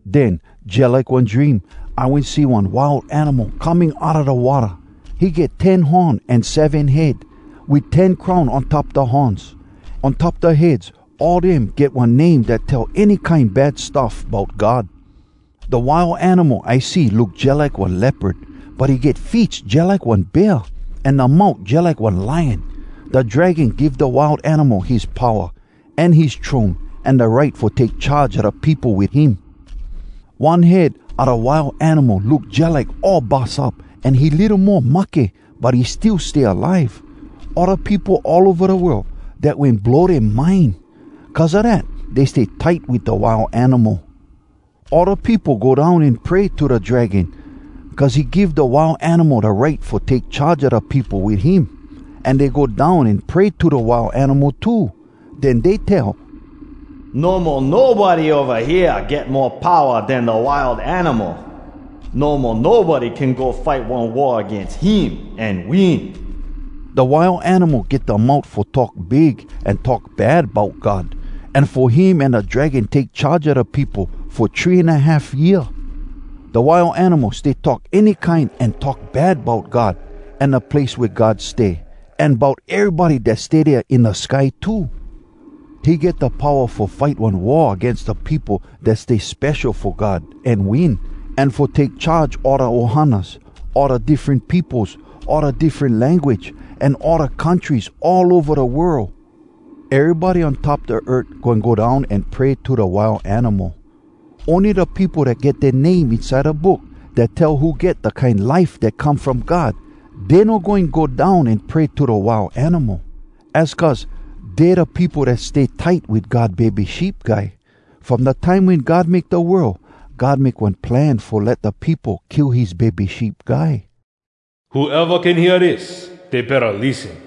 Den, jalike one dream, I wen see one Wild Animal coming outa da watta. He get ten horn an seven head, wit ten crown on top da horns. On top da heads, all dem get one name dat tell any kine bad stuff bout God. Da Wild Animal I see look jalike one leopard, but he get feets jalike one bear, an da mout jalike one lion. Da Dragon give da Wild Animal his powa, an his throne, an da right fo take charge a da peopo wit him. One head a da Wild Animal look jalike all bus up an he litto mo mahke, but he still stay alive. All da peopo all ova da world, dat wen blow dea mind. Cuz a dat dey stay tight wit da Wild Animal. All da peopo go down an pray to da Dragon, cuz he give da Wild Animal da right fo take charge a da peopo wit him. An dey go down an pray to da Wild Animal too. Den dey tell, “No mo nobody ova hea get mo powa den da Wild Animal! No mo nobody can go fight one war agains him an win!” Da Wild Animal get da mout fo talk big an talk bad bout God, an fo him an da Dragon take charge a da peopo fo three an a half year. Da Wild Animal stay talk any kine an talk bad bout God an da place wea God stay, an bout erybody dat stay dea in da sky too. He get da powa fo fight one war agains da peopo dat stay spesho fo God, an win, an fo take charge all da ohanas, all da diffren peopos, all da diffren language, an all da countries all ova da world. Erybody on top da earth goin go down an pray to da Wild Animal. Ony da peopo dat get dea name inside da Book Dat Tell Who Get Da Kine Life Dat Come From God, dey no goin go down an pray to da Wild Animal. Az cuz dey da peopo dat stay tight wit God Bebe Sheep Guy. From da time wen God make da world, God make one plan fo let da peopo kill his Bebe Sheep Guy. “Whoeva can hear dis, dey betta lissen!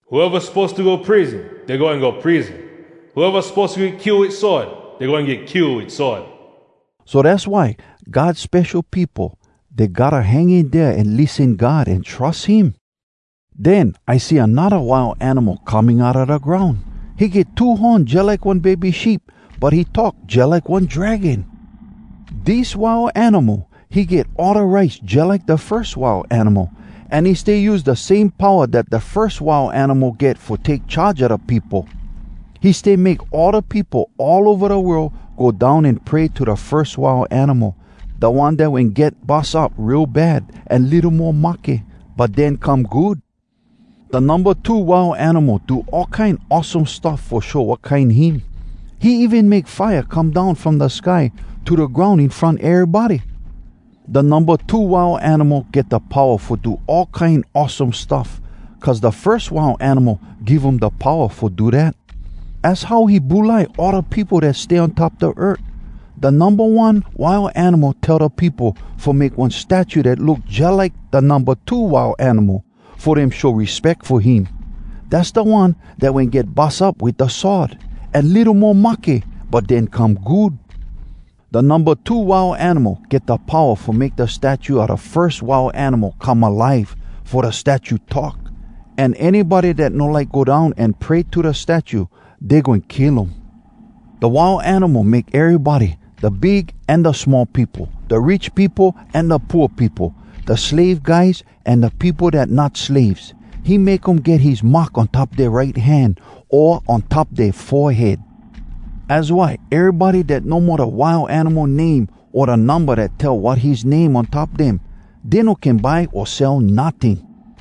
Whoeva suppose to go prison, Dey goin go prison! Whoeva suppose to get kill wit sword, Dey goin get kill wit sword!” So dass why, God spesho peopo, dey gotta hang in dea an lissen God an trus him! Den I see anodda Wild Animal coming outa da groun. He get two horn jalike one bebe sheep, but he talk jalike one dragon. Dis Wild Animal, he get all da rights jalike da firs Wild Animal, an he stay use da same powa dat da firs Wild Animal get fo take charge a da peopo. He stay make all da peopo all ova da world go down an pray to da firs Wild Animal, da one dat wen get bus up real bad, an litto mo mahke, but den come good. Da Numba Two Wild Animal do all kine awesome stuff fo show wat kine him. He even make fire come down from da sky to da groun in front erybody. Da Numba Two Wild Animal get da powa fo do all kine awesome stuff cuz da firs Wild Animal give um da powa fo do dat. Az how he bulai all da peopo dat stay on top da earth. Da Numba One Wild Animal tell da peopo fo make one statue dat look jalike da Numba Two Wild Animal, fo dem show respeck fo him. Dass da one dat wen get bus up wit da sword, an litto mo mahke, but den come good. Da Numba Two Wild Animal get da powa fo make da statue a da firs Wild Animal come alive fo da statue talk. An anybody dat no like go down an pray to da statue, dey goin kill um. Da Wild Animal make erybody, da big an da small peopo, da rich peopo an da pooa peopo, da slave guys an da peopo dat not slaves, he make um get his mark on top dea right hand o on top dea forehead. Az why erybody dat no mo da Wild Animal name o da numba dat tell wat his name on top dem, dey no can buy o sell notting.